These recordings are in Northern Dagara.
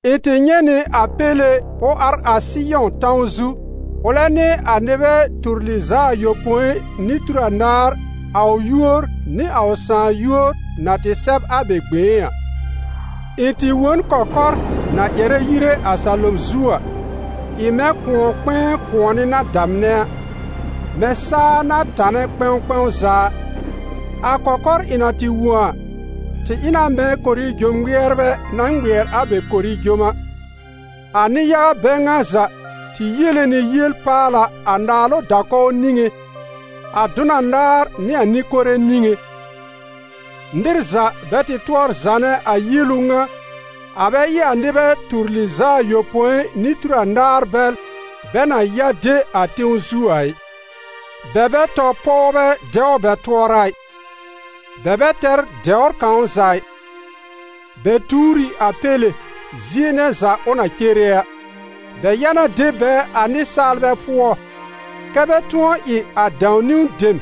Ɩ̃ tɩ nyɛ̃ nɩ a Péle ʋ ar a Sɩyɔ̃ tãw zu, ʋlɛ nɩ a nɩbɛ tur lɩz'a ayopõi nɩ tur anaar, a ʋ yúor nɩ a ʋ Sãà yúor na tɩ sɛb a bɛ gbẽé a. Ɩ̃ tɩ wõ n kɔkɔr na ƴɛrɛ yire a salom zu a, ɩ mɛ̃ kʋ̃ɔ-kpɛ̃ɛ kʋ̃ɔnɩ na damnɛ a, mɛ̃ saa na tanɛ kpɛ̃w kpɛ̃w za a. A kɔkɔr ɩ̃ na tɩ wõ a, tɩ ɩ na mɛ̃ korijom ŋmɩɛrbɛ na ŋmɩɛr a bɛ korijom a. A nɩ-yaga bɛ ŋa za tɩ yiele nɩ yiel-paala a naalʋ da-kɔw niŋé, a dʋn anaar nɩ a nɩ-kore niŋé. Nɩr za bɛ tɩ tʋɔr zanɛ a yielu ŋa, a bɛ ɩ a nɩbɛ tur lɩz'a ayopõi nɩ tur anaar bɛl bɛ na ya de a tẽw zu a ɩ. Bɛ bɛ tɔ pɔwbɛ dɛw bɛ tʋɔra ɩ, bɛ bɛ tɛr dɛwr kãw za ɩ. Bɛ tuur ɩ a Péle, zie nɛ za ʋ na cere a; bɛ ya na de bɛ a nɩsaalbɛ pʋɔ, kɛ́ bɛ tʋ̃ɔ ɩ a dãw-niwn dem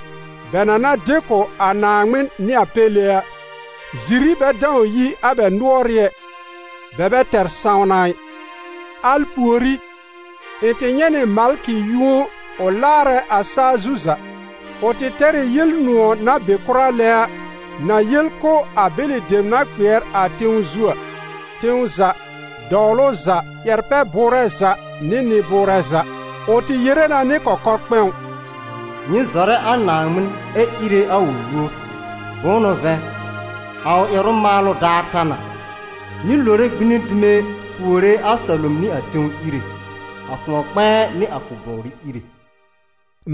bɛ na na de kʋ̀ a Naaŋmɩn nɩ a Péle a. Ziri bɛ dãw yi a bɛ nʋɔrɩ́ ɛ; bɛ bɛ tɛr sãwna ɩ. Al pùorí, ɩ̃ tɩ nyɛ̃ nɩ malkɩ yũo ʋ laarɛ a saa zu za; ʋ tɩ tɛr ɩ Yel-nʋ̃ɔ̀ na be kʋra lɛ a, na yel kʋ̀ a bɛlɩ dem na kpɩɛr a tẽw zu a: tẽw za, dɔwlʋ za, ƴɛr-pɛ-bʋʋrɛ za nɩ nɩ-bʋʋrɛ za. Ʋ tɩ yere na nɩ kɔkɔ-kpɛ̃w: «Nyɩ zɔrɛ a Naaŋmɩn ɛ íre a ʋ yúor, bʋ̃ʋ n'ʋ vɛ̃, a ʋ ƴɛrʋ-maalʋ daar ta na. Nyɩ lore gbine dume puore a salom nɩ a tẽw Íre, a kʋ̃ɔ-kpɛ̃ɛ nɩ a kʋl-bɔwrɩ Íre.»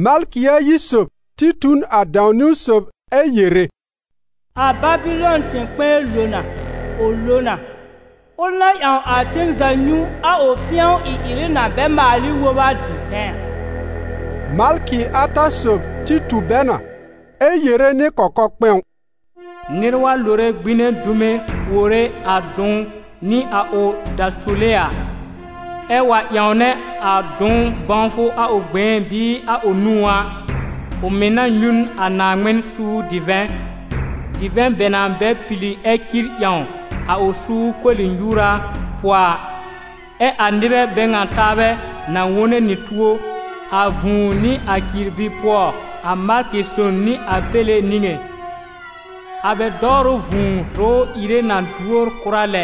Malkɩ ayi sob tɩ tu n a dãw-niwn sob, ɛ yere: «A Babɩlɔn tẽ-kpɛ̃ɛ lo na, ʋ lo na! Ʋl na ƴãw a ten za nyũ a ʋ pɩ̃ɔ ɩ-ɩrɩ na bɛ maal ɩ wob a divɛ̃ a.» Malkɩ ata sob tɩ tu bɛ na, ɛ yere nɩ kɔkɔ-kpɛ̃w: «Nɩr wa lore gbine dume puore a dʋ̃w nɩ a ʋ dasule a, ɛ́ wa ƴãwnɛ a dʋ̃w bãwfʋ a ʋ gbẽé bɩɩ a ʋ nũú a, ʋ mɩ̀ na nyũ n a Naaŋmɩn suur divɛ̃, divɛ̃ bɛ na bɛ pili ɛ cir ƴãw a ʋ suur koli-nyuura pʋɔ a; ɛ a nɩbɛ bɛ ŋa taabɛ na wone nɩ tuo a vũu nɩ a cirbi pʋɔ, a malkɩ son nɩ a Péle niŋé. A bɛ dɔwrʋ vũu zʋ̀ʋ́r ìre na duor kʋra lɛ.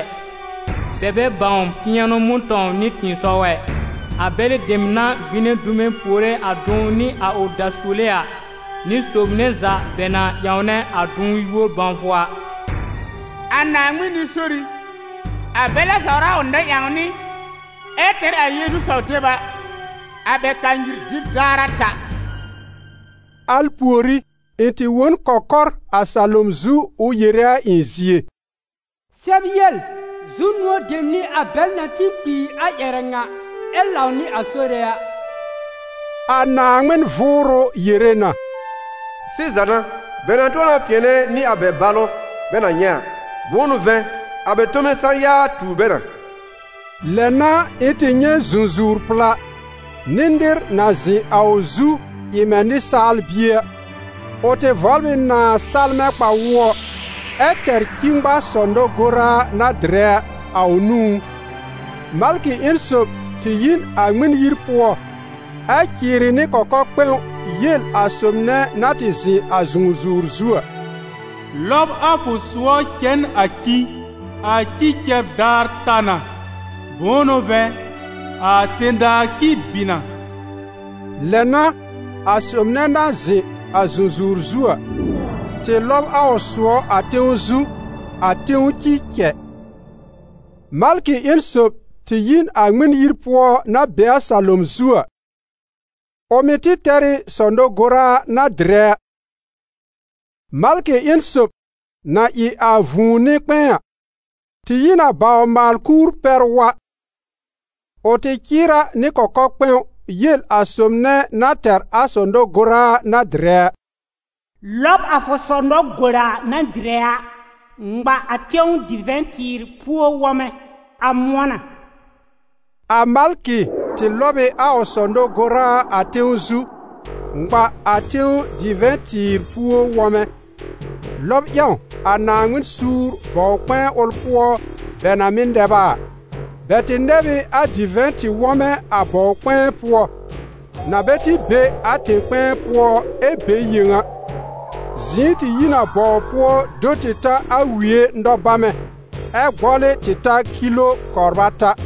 Bɛ bɛ bãw pɩ̃ɛnʋ mʋ̃tɔ̃w nɩ tɩ̃ɩsɔw ɛ, a bɛlɩ dem na gbine dume puore a dʋ̃w nɩ a ʋ dasule a, nɩ sob nɛ za bɛ na ƴãwnɛ a dʋ̃w yúor bãwfʋ a.» A Naaŋmɩn nɩ-sori, a bɛl na sawr a ʋ nɛ-ƴãwnɩ ɛ tɛr a Yeezu saw-deb a, a bɛ kanyir dɩb daar a ta. Al pùorí, ɩ̃ tɩ wõ n kɔkɔr a salom zu ʋ yere a ɩ̃ zie: «Sɛb yel: ‹Zu-nʋ̃ɔ dem n'ɩ a bɛl na tĩ kpiir a ƴɛrɛ ŋa ɛ lãw nɩ a Sore a!› A Naaŋmɩn Vʋʋrʋ yere na: ‹Sɩza n'a, bɛ na tʋ̃ɔ na pɩ̃ɛnɛ nɩ a bɛ balʋ bɛ na nyɛ̃ a, bʋ̃ʋ n'ʋ vɛ̃, a bɛ tome sã-ya tuur bɛ na.›» Lɛ n'a ɩ̃ tɩ nyɛ̃ zũzuwr-pla, nɩ nɩr na zɩ̃ a ʋ zu ɩ mɛ̃ nɩsaal-bie a. Ʋ tɩ vɔbl ɩ nãa salmɛ̃ kpa-wʋɔ, ɛ tɛr ci-ŋma-sɔ-nɔ-goraa na dɩrɛ a, a ʋ nũú. Malkɩ ƴẽn sob tɩ yi n a Ŋmɩn-yir pʋɔ, ɛ cɩɩrɩ nɩ kɔkɔ-kpɛ̃w yel a sob nɛ na tɩ zɩ̃ a zũzuwr zu a: «Lɔb a fʋ sʋɔ cɛ n a ci, a ci cɛb daar ta na; bʋ̃ʋ n'ʋ vɛ̃, a tẽ-daa ci bɩ na.» Lɛ n'a, a sob nɛ na zɩ̃ a zũzuwr zu a, tɩ lɔb a ʋ sʋɔ a tẽw zu, a tẽw ci cɛ. Malkɩ ƴẽn sob tɩ yi n a Ŋmɩn-yir pʋɔ na be a salom zu a; ʋ mɩ̀ tɩ tɛr ɩ sɔ-nɔ-goraa na dɩrɛ a. Malkɩ ƴẽn sob, na ɩ a vũu nɩ-kpɛ̃ɛ a, tɩ yi n a bawr-maal-kuur pɛr wa. Ʋ tɩ cɩɩr a nɩ kɔkɔ-kpɛ̃w yel a sob nɛ na tɛr a sɔ-nɔ-goraa na dɩrɛ a: «Lɔb a fʋ sɔ-nɔ-goraa na dɩrɛ a, ŋma a tẽw divɛ̃-tɩɩr-puó wɔmɛ: a mʋ̃ɔ na.» A malkɩ tɩ lɔb ɩ a ʋ sɔ-nɔ-goraa a tẽw zu, ŋma a tẽw divɛ̃-tɩɩr-puó wɔmɛ, lɔb ƴãw a Naaŋmɩn suur bɔw-kpɛ̃ɛ ʋl pʋɔ bɛ na mɩ́ nɛb a a. Bɛ tɩ nɛb ɩ a divɛ̃-tɩ-wɔmɛ a bɔw-kpɛ̃ɛ pʋɔ, na bɛ tɩ be a tẽ-kpɛ̃ɛ pʋɔ ɛ be yẽw a; zɩ̃ɩ tɩ yi n a bɔw pʋɔ do tɩ ta a wie nɔ-bamɛ, ɛ gbɔlɩ tɩ ta kilo kɔbr ata.